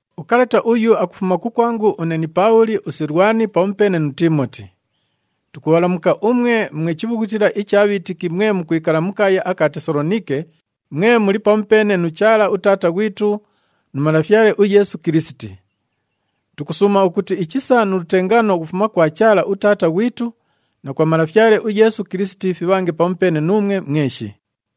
Ukalata uyu akufuma kukwangu une ni Paabhuli, uSilwani pamupeene nu Tiimoti. Tukubhalamuka umwe mwe chibhughutila icha bhiitiki mwe mukwikala mu kaaya aka Tesaloniike, mwe muli pamupeene nu Chaala uTaata ghwitu nu Malafyale uYeesu Kilisiti. Tukusuuma ukuti ichisa nu lutengaano ukufuma kwa Chaala uTaata ghwitu na kwa Malafyale uYeesu Kilisiti fibhange pamupeene nuumwe mweshi.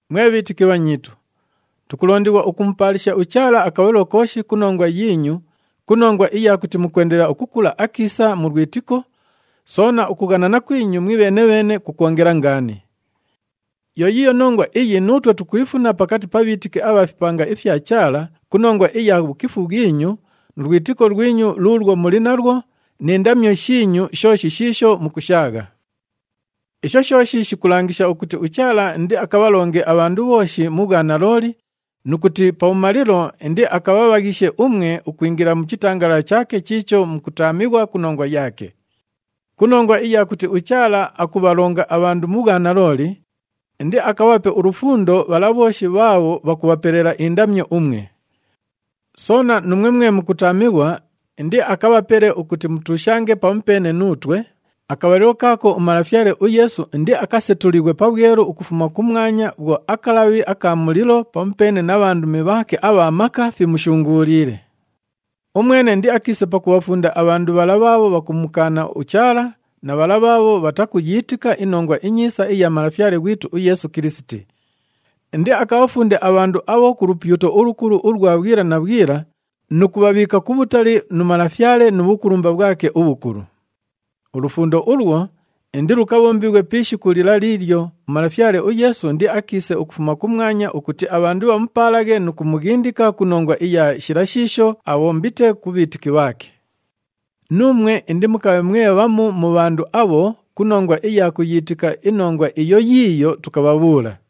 Mwe bhiitiki bhanyiitu, tukulondighwa ukumupaalisha uChaala akabhalilo kooshi ku nongwa yiinyu ku nongwa iya kuti mukwendelela ukukula akiisa mu lwitiko, soona ukughanana kwinyu mwibheene-bheene kukwongela ngaani. Yo yiiyo nongwa iyi nuutwe tukwifuna pakati pa bhiitiki abha fipanga ifya Chaala ku nongwa iya bhukifu bhwinyu, nu lwitiko lwinyu luulwo muli nalwo ni ndamyo shiinyu shooshi shiisho mukushaagha. Isho shooshi shikulangisha ukuti uChaala indiakabhalonge abhandu bhooshi mu bhwanalooli nu kuti pabhumalilo indiakabhabhaghishe umwe ukwingila mu chitangalala chaake chiicho mukutaamighwa ku nongwa yaake. Ku nongwa iya kuti uChaala akubhalonga abhandu mu bhwanalooli, indiakabhape ulufundo bhala bhooshi bhaabho bhakubhapelela indamyo umwe. Soona, nuumwe mwe mukutaamighwa, indiakabhapele ukuti mutuushange pamupeene nuutwe, akabhalilo kaako uMalafyale uYeesu indiakasetulighwe pabhwelu ukufuma kumwanya bhwo akalabhi aka mulilo pamupeene na bhandumi bhaake abha maka fimushunguuliile. Umwene indiakiise pakubhafunda abhandu bhala bhaabho bhakumukaana uChaala na bhala bhaabho bhatakuyiitika iNongwa iNyiisa iya Malafyale ghwitu uYeesu Kilisiti. Indiakabhafunde abhandu abho ku lupyuto ulukulu ulwa bhwila na bhwila nu kubhabhiika kubhutali nu Malafyale nu bhukulumba bhwake ubhukulu. Ulufundo ulwo indilukabhombighwe pi ishiku lila liilyo uMalafyale uYeesu indiakiise ukufuma kumwanya ukuti abhandu bhamupaalaghe nu kumughindika ku nongwa iya shila shiisho abhombite ku bhiitiki bhaake. Nuumwe indimukabhe mwe bhamu mu bhandu abho ku nongwa iya kuyiitika inongwa iyo yiiyo tukabhabhuula.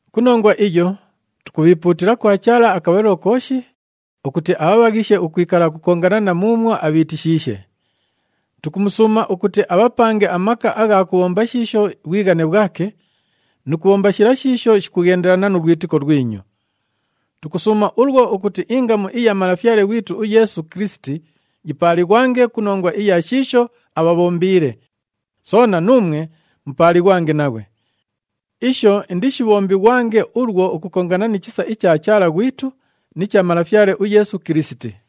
Ku nongwa iyo, tukubhiipuutila kwa Chaala akabhalilo kooshi ukuti abhabhaghishe ukwikala ukukongana na muumwo abhiitishiishe. Tukumusuuma ukuti abhapange amaka agha kubhomba shiisho bhwighane bhwake nu kubhomba shila shiisho shikughendelana nu lwitiko lwinyu. Tukusuuma ulwo ukuti ingamu iya Malafyale ghwitu uYeesu Kilisiti yipaalighwange ku nongwa iya shiisho abhabhombiile, soona nuumwe mupaalighwange naghwe. Isho indishibhombighwange ulwo ukukongana ni chisa icha Chaala ghwitu ni cha Malafyale uYeesu Kilisiti.